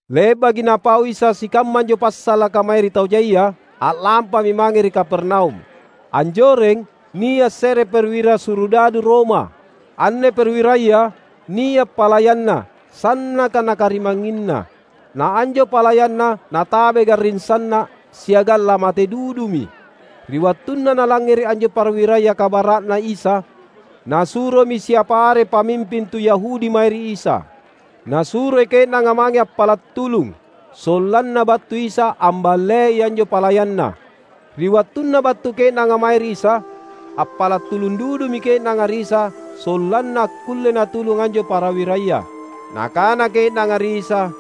Le’baki Napau Isa sikamma anjo passalaka mae ri tau jaia, a’lampami mange ri Kapernaum. Anjoreng nia’ se’re perwira surudadu Roma. Anne perwiraya, nia’ palayanna, sannaka nakarimangnginna. Na anjo palayanna natabai garring sanna’, siagang lamate dudumi. Ri wattunna nalangngere’ anjo perwiraya kabara’Na Isa, nasuromi siapa are pamimping tu Yahudi mae ri Isa. Nasuroi ke’nanga mange appala’ tulung, sollanna battu Isa amballei anjo palayanna. Ri wattunna battu ke’nanga mae ri Isa, appala’ tulung dudumi ke’nanga ri Isa sollanna akkulle Natulung anjo perwiraya. Nakana ke’nanga ri Isa,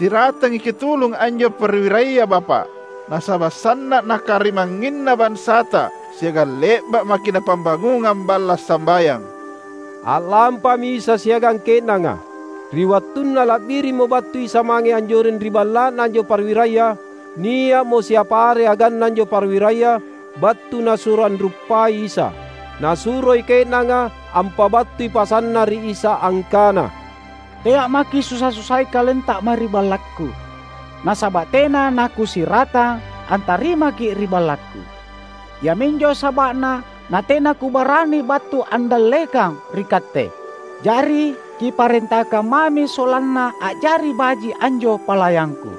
"Siratangi Kitulung anjo perwiraya Bapa’ nasaba’ sanna’ nakarimangnginna bansata siagang le’ba’ maki’ napambangungang balla’ sambayang." A’lampami Isa siagang ke’nanga. Ri wattunna la’birimmo battu Isa mange anjoreng ri balla’na anjo perwiraya, nia’mo siapa are aganna anjo perwiraya battu nasuro anruppai Isa. Nasuroi ke’nanga ampabattui pasanna ri Isa angkana, "Tea’ maki’ susa-susai KalenTa mae ri ballakku, nasaba’ tena nakusiratang antarimaKi’ ri ballakku. Iaminjo saba’na natena kubarani battu andallekang ri Katte. Jari Kiparentakang mami sollanna a’jari baji’ anjo palayangku.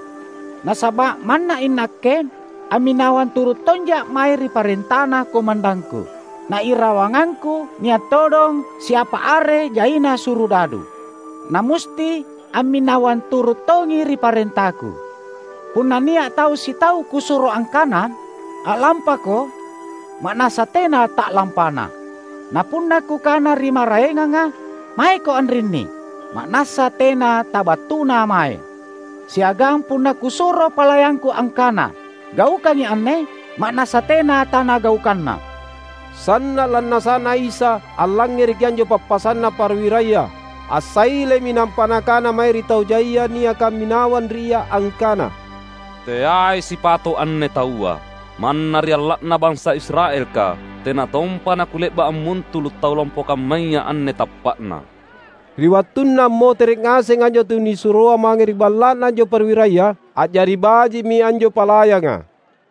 Nasaba’ manna inakke amminawang turu’ tonja’ mae ri parentana komandangku. Na irawangangku nia’ todong siapa are jaina surudadu, na musti amminawang turu’ tongi ri parentaku. Punna nia’ tau sitau kusuro angkana, ‘A’lampako!’ ma’nassa tena ta’lampana; na punna kukana ri maraenganga, ‘Maeko anrinni!’ ma’nassa tena tabattuna mae. Siagang punna kusuro palayangku angkana, ‘Gaukangi anne!’ ma’nassa tena tanagaukanna." Sanna’ lannasa’Na Isa allangngereki anjo pappasanna perwiraya. Assailemi nampa Nakana mae ri tau jai niaka amminawang ri Ia angkana, "Teai sipato’ anne taua. Manna ri alla’na bansa Israelka tena tompa naKule’ba’ ammuntulu’ tau lompo kammaya anne tappa’na!" Ri wattunna ammotere’ ngaseng anjo tunisuroa mange ri balla’na anjo perwiraya, a’jari baji’mi anjo palayanga.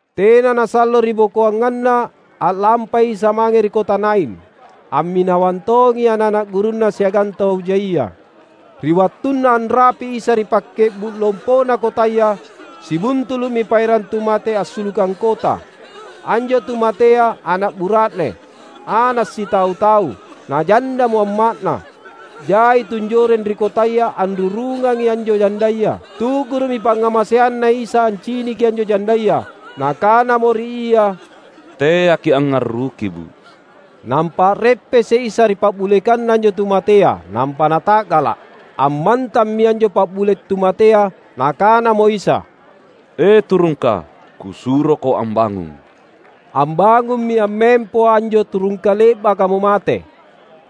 Tena nasallo ribokoanganna, a’lampai Isa mange ri kota Nain. Amminawang tongi ana’-ana’ gurunNa siagang tau jaia. Ri wattunna anrapi’ Isa ri pakke’bu’ lompona kotaya sibuntulu’mi paerang tu mate assulukang kota. Anjo tu matea ana’ bura’ne, ana’ sitau-tau, na jandamo amma’na. Jai tunjoreng ri kotaya anrurungangi anjo jandaya. Tu’guru’mi pangngamaseanNa Isa anciniki anjo jandaya. Nakanamo ri ia, "Teaki’ angngarruki bu’!" Nampa a’reppese’ Isa ri pa’bulekanna anjo tu matea nampa Nata’gala’! Ammantammi anjo pabule’ tu matea. Nakanamo Isa, "E, turungka, Kusuroko ambangung!" Ambangummi ammempo anjo turungka le’bakamo mate,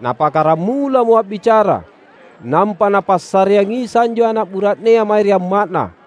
nappakkaramulamo a’bicara. Nampa Napassareang Isa anjo ana’ bura’nea mae ri amma’na.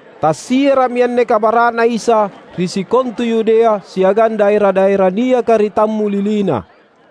Tassiara’mi anne kabara’Na Isa ri sikontu Yudea siagang daera-daera niaka ri tammulilina.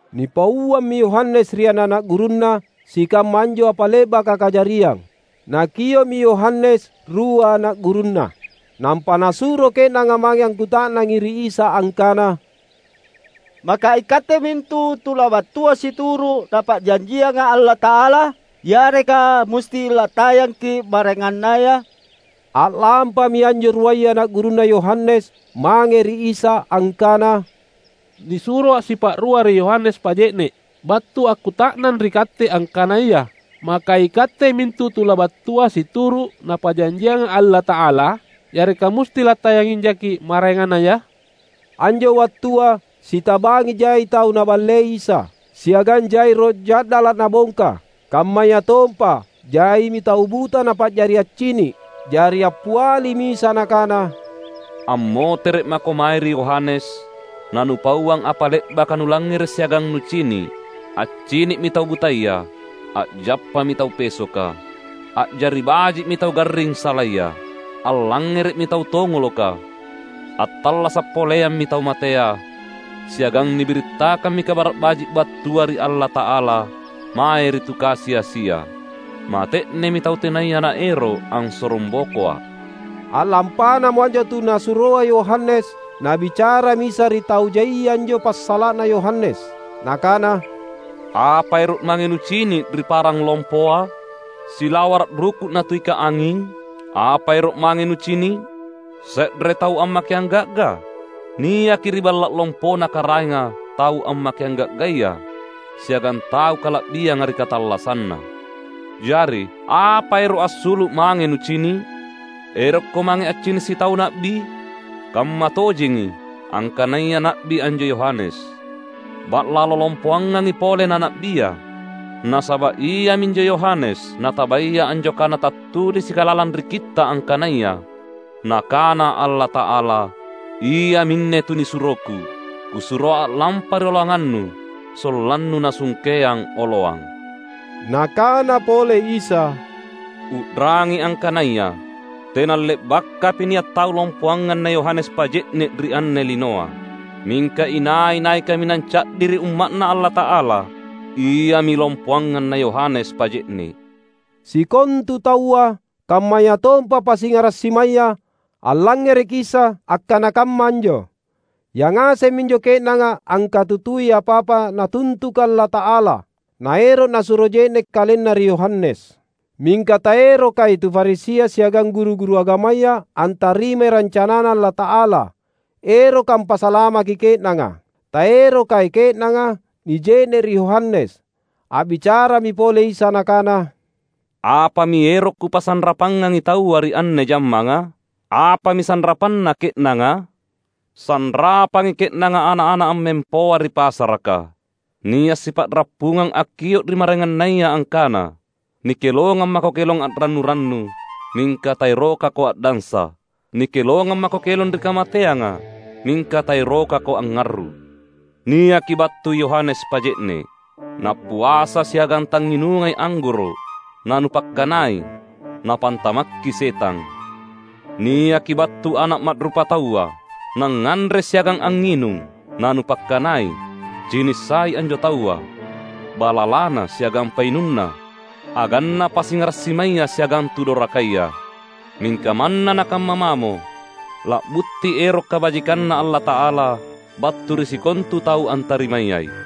Nipauammi Yohanes ri ana’-ana’ gurunna sikamma anjo apa le’baka kajariang. Nakio’mi Yohanes rua ana’ gurunna, nampa nasuro ke’nanga mange akkuta’nang ri Isa angkana, "Maka iKatte mintu tu labattua situru’ Napa’janjianga Allata’ala? Yareka musti lattayangki’ maraengannaya?" A’lampami anjo ruaya ana’ gurunna Yohanes mange ri Isa angkana, "Nisuroa’ sipa’rua ri Yohanes Paje’ne’ battu akkuta’nang ri Katte angkanaya, maka iKatte mintu tu labattua situru’ Napa’janjianga Allata’ala? Yareka musti lattayangijaki’ maraengannaya?" Anjo wattua, sitabangi jai tau Naballei Isa, siagang jai roh ja’dala’ Nabongka; kammayatompa jaimi tau buta Napa’jari accini’. Jari appialimi Isa Nakana, "Ammotere’ mako mae ri Yohanes na nupauang apa le’baka nulangngere’ siagang nucini’: accini’mi tau butaya, a’jappami tau pesoka, a’jari baji’mi tau garring salaya, allangngere’mi tau tongoloka, attallasa’ poleammi tau matea, siagang nibirittakammi Kabara’ Baji’ battua ri Allata’ala, mae ri tu kasi-asia. Mate’nemi tau tenaya naero’ ansorongbokoA’." A’lampanamo anjo tu nasuroa Yohanes, Nabicarami Isa ri tau jaia anjo passala’na Yohanes. Nakana, "Apa ero’ mange nucini’ ri parang lompoa? Silawara’ ruku’ natuika anging? Apa ero’ mange nucini’? Se’re tau ammakeang ga’ga? Niaki ri balla’ lompona karaenga tau ammakeang ga’gaya siagang tau kala’bianga ri katallassanna! Jari, apa ero’ assulu’ mange nucini’? Erokko mange accini’ sitau na’bi? Kammatojengi, angkanaya na’bi anjo Yohanes; ba’lalo lompoangangi pole na na’bia. Nasaba’ iaminjo Yohanes natabaya anjo kana tattulisika lalang ri Kitta’ angkanaya, Nakana Allata’ala, ‘Iaminne tunisuroKu,’ ‘Kusuroa a’lampa rioloanganNu, sollanNu nasungkeang oloang!’" Nakana pole Isa, "U’rangi angkanaya tenale’bakapi nia’ tau lompoangang na Yohanes Paje’ne’ ri anne linoa. Mingka inai-nai kaminang ca’di ri umma’Na Allata’ala, iami lompoangang na Yohanes Paje’ne’." Sikontu taua — kammayatompa pasingara’ simaya — allangngereki Isa akkana kamma anjo; yangaseng minjo ke’nanga angkatutui apa-apa Natuntuka Allata’ala, naero’ nasuro je’ne’ kalenna ri Yohanes. Mingka taerokai tu Farisia siagang guru-guru agamaya antarimai rancanaNa Allata’ala eroka ampasalamaki ke’nanga. Taerokai ke’nanga nije’ne’ ri Yohanes. A’bicarami pole Isa Nakana, "Apami ero’ Kupasanrapangangi taua ri anne jammanga? Apami sanrapanna ke’nanga? Sanrapangi ke’nanga ana’-ana’ ammempoa ri pasaraka; nia’ sipa’rappungang akkio’ ri maraengannaya angkana, ‘Nikelongang mako kelong a’rannu-rannu, mingka taerokako a’dansa! Nikelongang mako kelong ri kamateanga, mingka taerokako angngarru’!’ Niaki battu Yohanes Paje’ne’ — nappuasa siagang tangnginungai anggoro’ — na nupakkanai, ‘Napantamakki setang!’ Niaki battu Ana’ Ma’rupataua — nangnganre siagang angnginung — na nupakkanai, ‘Cini’ sai anjo taua, balalana siagang painunna, aganna pasingara’ simaya siagang tu dorakaya.’ Mingka manna nakamma mamo, la’butti ero’ kabajikanNa Allata’ala battu ri sikontu tau antarimayai."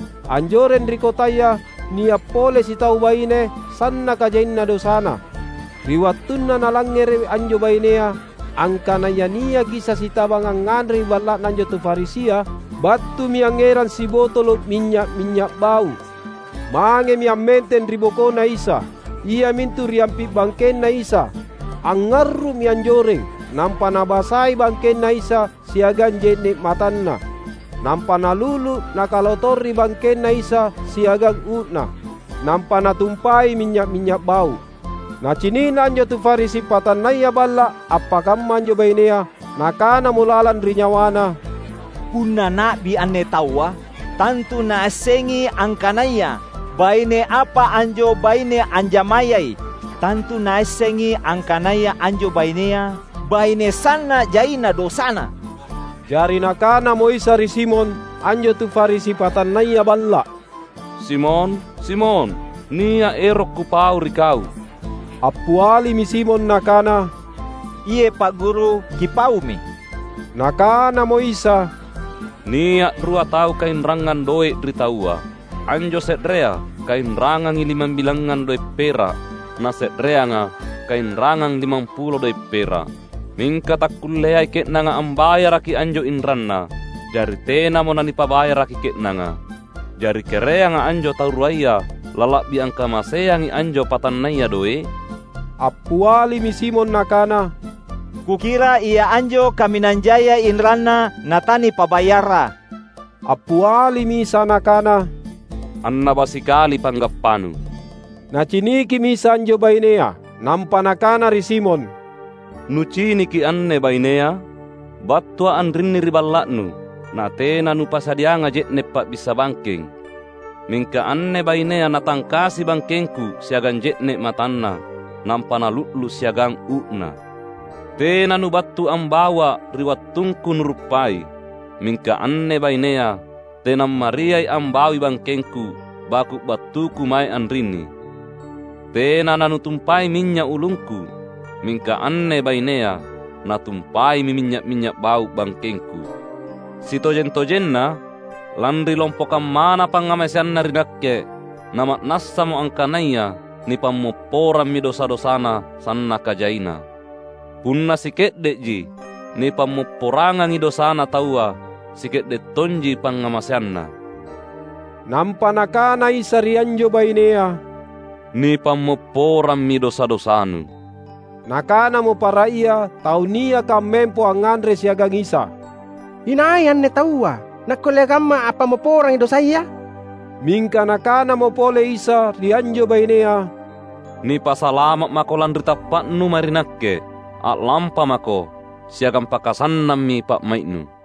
Anjoreng ri kotaya nia’ pole sitau baine sannaka jaina dosana. Ri wattunna nalangngere’ anjo bainea angkanaya niaki Isa sitabang angnganre ri balla’na anjo tu Farisia, battumi angngerang sibotolo’ minynya’-minynya’ bau’. Mangemi ammenteng ri bokoNa Isa, iamintu ri ampi’ bangkenNa Isa. Angngarru’mi anjoreng, nampa nabasai bangkenNa Isa siagang je’ne’ matanna. Nampa nalu’lu’ nakalotori bangkenNa Isa siagang uu’na, nampa natumpai minynya’-minynya’ bau’. Nacini’na anjo tu Farisi patannaya balla’ appakamma anjo bainea, nakanamo lalang ri nyawana, "Punna na’bi anne Taua, tantu Naassengi angkanaya baine apa anjo baine anjamayai; tantu Naassengi angkanaya anjo bainea, baine sanna’ jaina dosana!" Jari Nakanamo Isa ri Simon, anjo tu Farisi patannaya balla’, "Simon, Simon, nia’ ero’ Kupau ri kau." Appialimi Simon nakana, "Iye’ Pa’ Guru, Kipaumi." Nakanamo Isa, "Nia’ rua tau kainrangang doe’ ri taua. Anjo se’rea kainrangangi limambilangngang doe’ pera’ na se’reanga kainrangang limampulo doe’ pera’. Mingka takkulleai ke’nanga ambayaraki anjo inranna. Jari tenamo nanipabayaraki ke’nanga. Jari kereanga anjo tau ruaya lala’bi angkamaseangi anjo patannaya doe’?" Appialimi Simon nakana, "Kukira ia anjo kaminang jaia inranna na tanipabayarra!" Appialimi Isa Nakana, "Annaba sikali panggappanu." Nacinikimi Isa anjo bainea, nampa Nakana ri Simon, "Nuciniki anne bainea? BattuA’ anrinni ri balla’nu, natena nupasadiangA’ je’ne’ pa’bissa bangkeng; mingka anne bainea natangkasi bangkengKu siagang je’ne’ matanna, nampa nalu’lu’ siagang uu’na. Tena nubattu ambauA’ ri wattungKu nuruppai; mingka anne bainea tenammariai ambaui bangkengKu baku’ battuKu mae anrinni. Tena nanutumpai minynya’ ulungKu, mingka anne bainea natumpaimi minynya’-minynya’ bau’ bangkengKu. Sitojeng-tojenna, lanri lompo kammana pangngamaseanna ri Nakke, na ma’nassamo angkanaya nipammopporammi dosa-dosana sannaka jaina. Punna sike’de’ji nipammopporangangi dosana taua, sike’de’ tonji pangngamaseanna." Nampa Nakana Isa ri anjo bainea, "Nipammopporammi dosa-dosanu." Nakanamo para ia tau niaka ammempo angnganre siagang Isa, "Inai anne taua, nakkulle kamma ampammopporangi dosaya?" Mingka Nakanamo pole Isa ri anjo bainea, "Nipasalama’ mako lanri tappa’nu mae ri Nakke. A’lampamako siagang pakasannammi pa’mai’nu!"